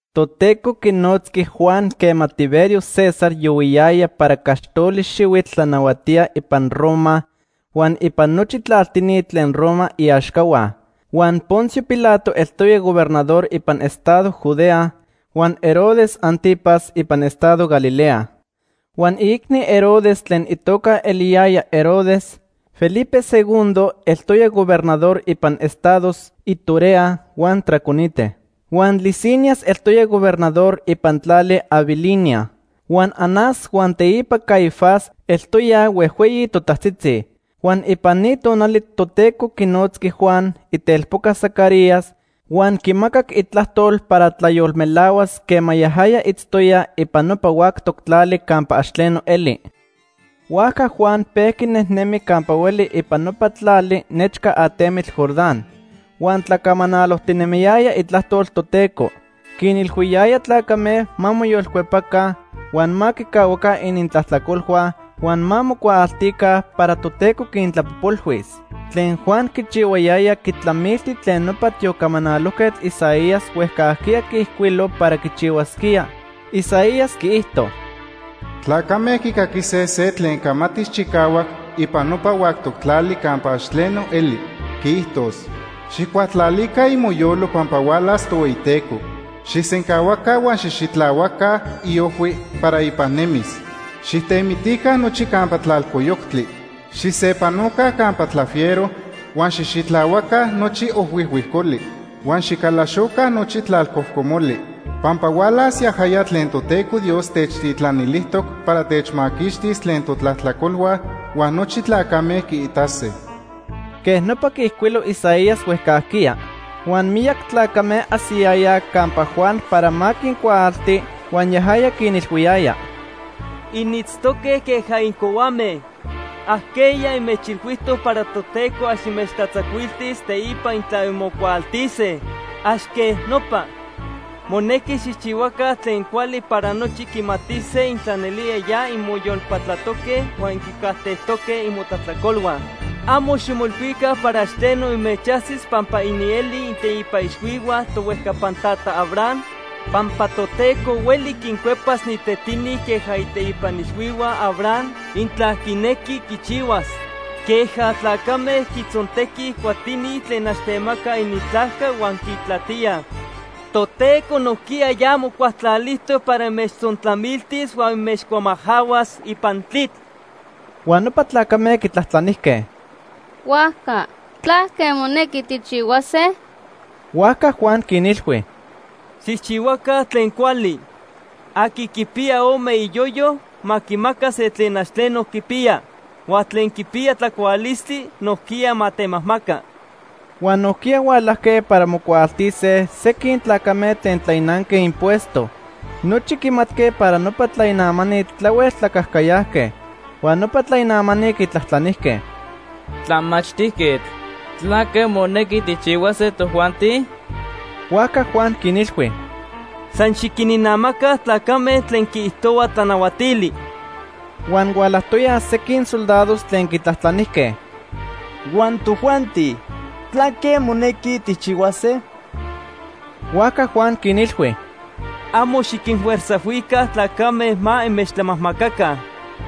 Toteco quinotzqui Juan quema Tiberio César yohuiyaya para caxtoli xihuitl tlanahuatía ipan Roma huan ipan nochi tlaltini tlen Roma iaxcahua. Huan Poncio Pilato eltoya gobernador ipan estado Judea, huan Herodes Ántipas ipan estado Galilea. Huan iicni Herodes tlen itoca eliyaya Herodes Felipe II eltoya gobernador ipan estados Iturea huan Traconite. Huan Lisinias eltoya gobernador ipan tlali Abilinía. Huan Anás huan teipa Caifás eltoyaj huejhueyi totajtzitzi. Huan ipan ni tonali Toteco quinotzqui Juan, itelpoca Zacarías, huan quimacac itlajtol para tlayolmelahuas quema yajaya itztoya ipan nopa huactoc tlali campa ax tleno eli. Huajca Juan pejqui nejnemi campa hueli ipan nopa tlali nechca atemitl Jordán. Huan tlacamanalojtinemiyaya itlajtol Toteco. Quinilhuiyaya tlacame ma moyolcuepaca, huan ma quicahuaca inintlajtlacolhua huan ma mocuaaltica para Toteco quintlapojpolhuis. Tlen Juan quichihuayaya quitlamilti tlen nopa tiocamanalojquetl Isaías huejcajquiya quiijcuilo para quichihuasquía. Isaías quiijto: “Tlacame quicaquise se tlen camatis chicahuac ipan nopa huactoc tlali campa ax tleno eli. Quiijtos: ‘Xijcualtlalica imoyolo pampa hualas Tohueyiteco. Xijsencahuaca huan xijxitlahuaca iojhui para ipan nemis. Xijtemitica nochi campa tlalcoyoctli. Xijsepanoca campa tlafiero, huan xijxitlahuaca nochi ojhuijhuicoli, huan xicalaxoca nochi tlalcojcomoli. Pampa hualas yajaya tlen Toteco Dios techtitlanilijtoc para techmaquixtis tlen totlajtlacolhua, huan nochi tlacame quiitase.’” Quej nopa quiijcuilo Isaías huejcajquiya. Huan miyac tlacame ajsiyayaj campa Juan para ma quincuaalti, huan yajaya quinilhuiyaya: ―Initztoque queja incohuame. ¿Ajqueya inmechilhuijtoc para Toteco ax inmechtlatzacuiltis teipa intla inmocuaaltise? Ax quej nopa. Monequi xijchihuaca tlen cuali para nochi quimatise intla nelía ya inmoyolpatlatoque huan inquicajtejtoque imotlajtlacolhua. Amo ximoilhuica para ax tleno inmechajsis pampa inielij ininteipa ixhuihua tohuejcapan tata Abraham pampa Toteco hueli quincuepas ni tetini queja iteipa ixhuihua Abraham intla quinequi quichihuas. Queja tlacame quitzontequij cuatini tlen ax temacaj inintlajca huan quintlatíaj, Toteco nojquiya ya mocualtlalijtoc para inmechtzontlamiltis huan inmechcuamajcahuas ipan tlitl. Huan nopa tlacame quitlajtlanijque: ―Huajca, ¿tlaque monequi tijchihuase? Huajca Juan quinilhui: ―Xijchihuaca tlen cuali. Aqui quipiya ome iyoyo ma quimaca se tlen ax tleno quipiya. Huan tlen quipiya tlacualistli nojquiya ma temajmaca. Huan nojquiya hualajque para mocuaaltise sequin tlacame tlen tlainanque impuesto. Nochi quimatque para nopa tlainamani tlahuel tlacajcayajque. Huan nopa tlainamani quitlajtlanijque: ―Tlamachtijquetl, ¿tlaque monequi tijchihuase tojuanti? Huajca Juan quinilhui: ―San xiquininamaca tlacame tlen quiijtohua tlanahuatili. Huan hualajtoyaj sequin soldados tlen quitlajtlanijque: ―Huan tojuanti, ¿tlaque monequi tijchihuase? Huajca Juan quinilhui: ―Amo xiquinfuerzajhuica tlacame ma inmechtlamajmacaca.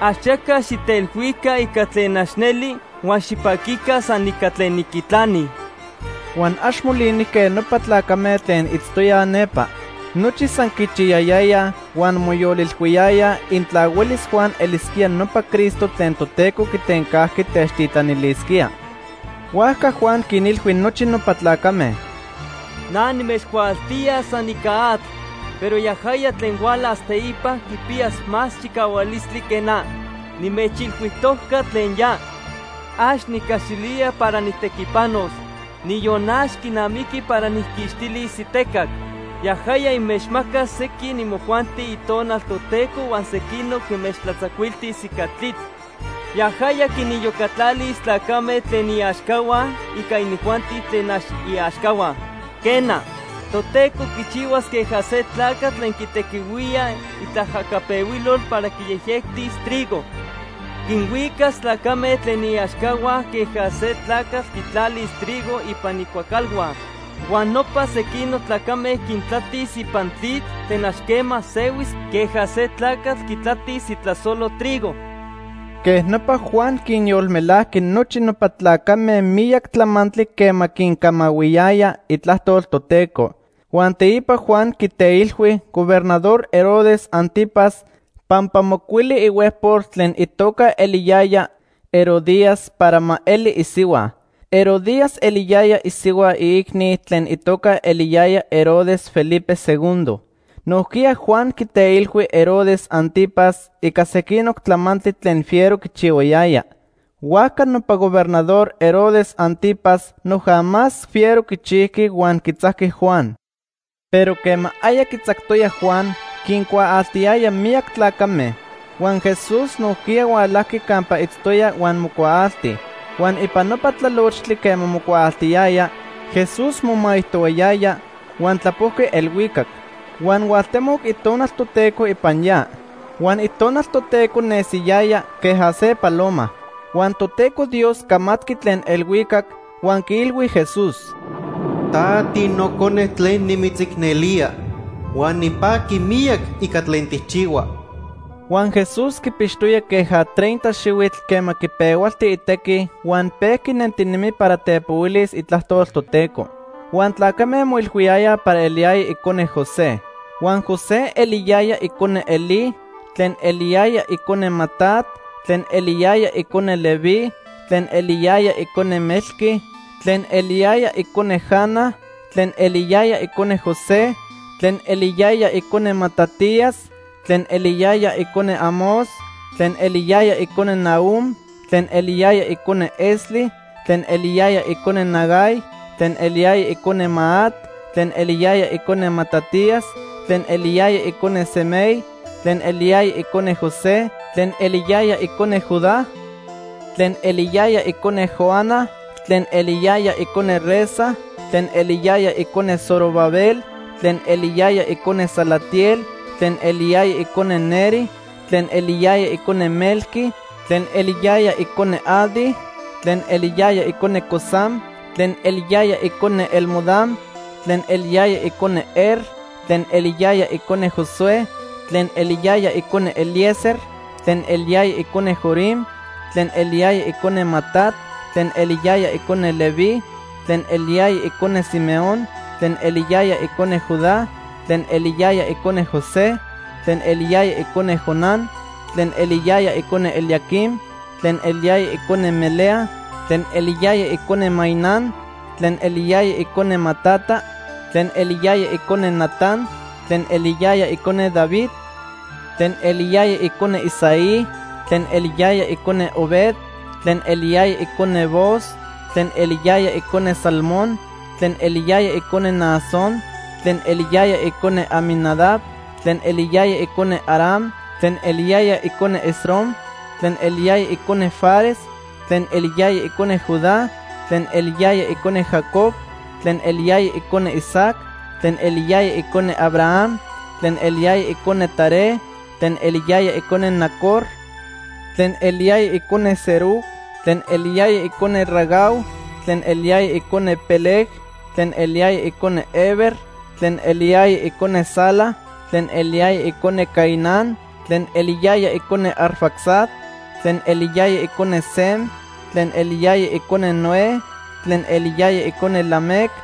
Axaca xijteilhuica ica tlen ax neli huan xipaquica san ica tlen inquitlanij. Huan ax molinijque nopa tlacame tlen itztoyaj nepa. Nochi san quichiyayayaj huan moyolilhuiyayaj intla huelis Juan elisquía nopa Cristo tlen Toteco quitencajqui techtitlanilisquía. Huajca Juan quinilhui nochi nopa tlacame: ―Na nimechcuaaltía san ica atl, pero yajaya tlen hualas teipa quipiyas más chicahualistli que na. Nimechilhuijtojca tlen ya. Ax nicaxilía para nijtequipanos, niyon ax quinamiqui para nijquixtilis itecac. Yajaya inmechmacas sequin imojuanti Itonal Toteco huan sequinoc inmechtlatzacuiltis ica tlitl. Yajaya quiniyocatlalis tlacame tlen iaxcahua ica inijuanti tlen ax iaxcahua. Quena, Toteco quichihuas queja se tlacatl tlen quitequihuía itlaajacapehuilol para quiyejyectis trigo. Quinhuicas tlacame tlen iaxcahua queja se tlacatl quitlalis itrigo ipan icuacalhua. Huan nopa sequinoc tlacame quintlatis ipan tlitl tlen ax quema sehuis queja se tlacatl quitlatis itlasolo trigo. Quej nopa, Juan quinyolmelajqui nochi nopa tlacame miyac tlamantli quema quincamahuiyaya itlajtol Toteco. Huan teipa Juan quiteilhui Gobernador Herodes Ántipas pampa mocuili ihuejpol tlen itoca eliyaya Herodías para ma eli isihua. Herodías eliyaya isihua iicni tlen itoca eliyaya Herodes Felipe II. Nojquiya Juan quiteilhui Herodes Ántipas ica sequinoc tlamantli tlen fiero quichihuayaya. Huajca nopa Gobernador Herodes Ántipas noja más fiero quichijqui huan quitzajqui Juan. Pero quema aya quitzactoyaj Juan, quincuaaltiyaya miyac tlacame, huan Jesús nojquiya hualajqui campa itztoya huan mocuaalti. Huan ipan nopa tlalochtli quema mocuaaltiyaya, Jesús momaijtohuayaya huan tlapojqui elhuicac. Huan hualtemoc Itonal Toteco ipan ya. Huan Itonal Toteco nesiyaya queja se paloma. Huan Toteco Dios camatqui tlen elhuicac huan quiilhui Jesús: ―Ta tiNocone tlen nimitzicnelía huan nipaqui miyac ica tlen tijchihua. Huan Jesús quipixtoya queja treinta xihuitl quema quipehualti itequi huan pejqui nentinemi para tepohuilis itlajtol Toteco. Huan tlacame moilhuiyayaj para eliyaya icone José. Huan José eliyaya icone Elí, tlen eliyaya icone Matat, tlen eliyaya icone Leví, tlen eliyaya icone Melqui, tlen eliyaya icone Jana, tlen eliyaya icone José, tlen eliyaya icone Matatías, tlen eliyaya icone Amós, tlen eliyaya icone Nahum, tlen eliyaya icone Esli, tlen eliyaya icone Nagai, tlen eliyaya icone Maat, tlen eliyaya icone Matatías, tlen eliyaya icone Semei, tlen eliyaya icone José, tlen eliyaya icone Judá, tlen eliyaya icone Joana, tlen eliyaya icone Resa, tlen eliyaya icone Zorobabel, tlen eliyaya icone Salatiel, tlen eliyaya icone Neri, tlen eliyaya icone Melqui, tlen eliyaya icone Adi, tlen eliyaya icone Cosam, tlen eliyaya icone Elmodam, tlen eliyaya icone Er, tlen eliyaya icone Josué, tlen eliyaya icone Eliezer, tlen eliyaya icone Jorim, tlen eliyaya icone Matat, tlen eliyaya icone Leví, tlen eliyaya icone Simeón, tlen eliyaya icone Judá, tlen eliyaya icone José, tlen eliyaya icone Jonán, tlen eliyaya icone Eliaquim, tlen eliyaya icone Melea, tlen eliyaya icone Mainán, tlen eliyaya icone Matata, tlen eliyaya icone Natán, tlen eliyaya icone David, tlen eliyaya icone Isaí, tlen eliyaya icone Obed, tlen eliyaya icone Booz, tlen eliyaya icone Salmón, tlen eliyaya icone Naasón, tlen eliyaya icone Aminadab, tlen eliyaya icone Aram, tlen eliyaya icone Esrom, tlen eliyaya icone Fares, tlen eliyaya icone Judá, tlen eliyaya icone Jacob, tlen eliyaya icone Isaac, tlen eliyaya icone Abraham, tlen eliyaya icone Taré, tlen eliyaya icone Nacor, tlen eliyaya icone Serug, tlen eliyaya icone Ragau, tlen eliyaya icone Peleg, tlen eliyaya icone Heber, tlen eliyaya icone Sala, tlen eliyaya icone Cainán, tlen eliyaya icone Arfaxad, tlen eliyaya icone Sem, tlen eliyaya icone Noé, tlen eliyaya icone Lamec,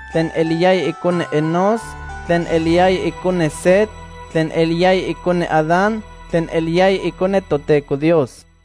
tlen eliyaya icone Enós, tlen eliyaya icone Set, tlen eliyaya icone Adán, tlen eliyaya icone Toteco Dios.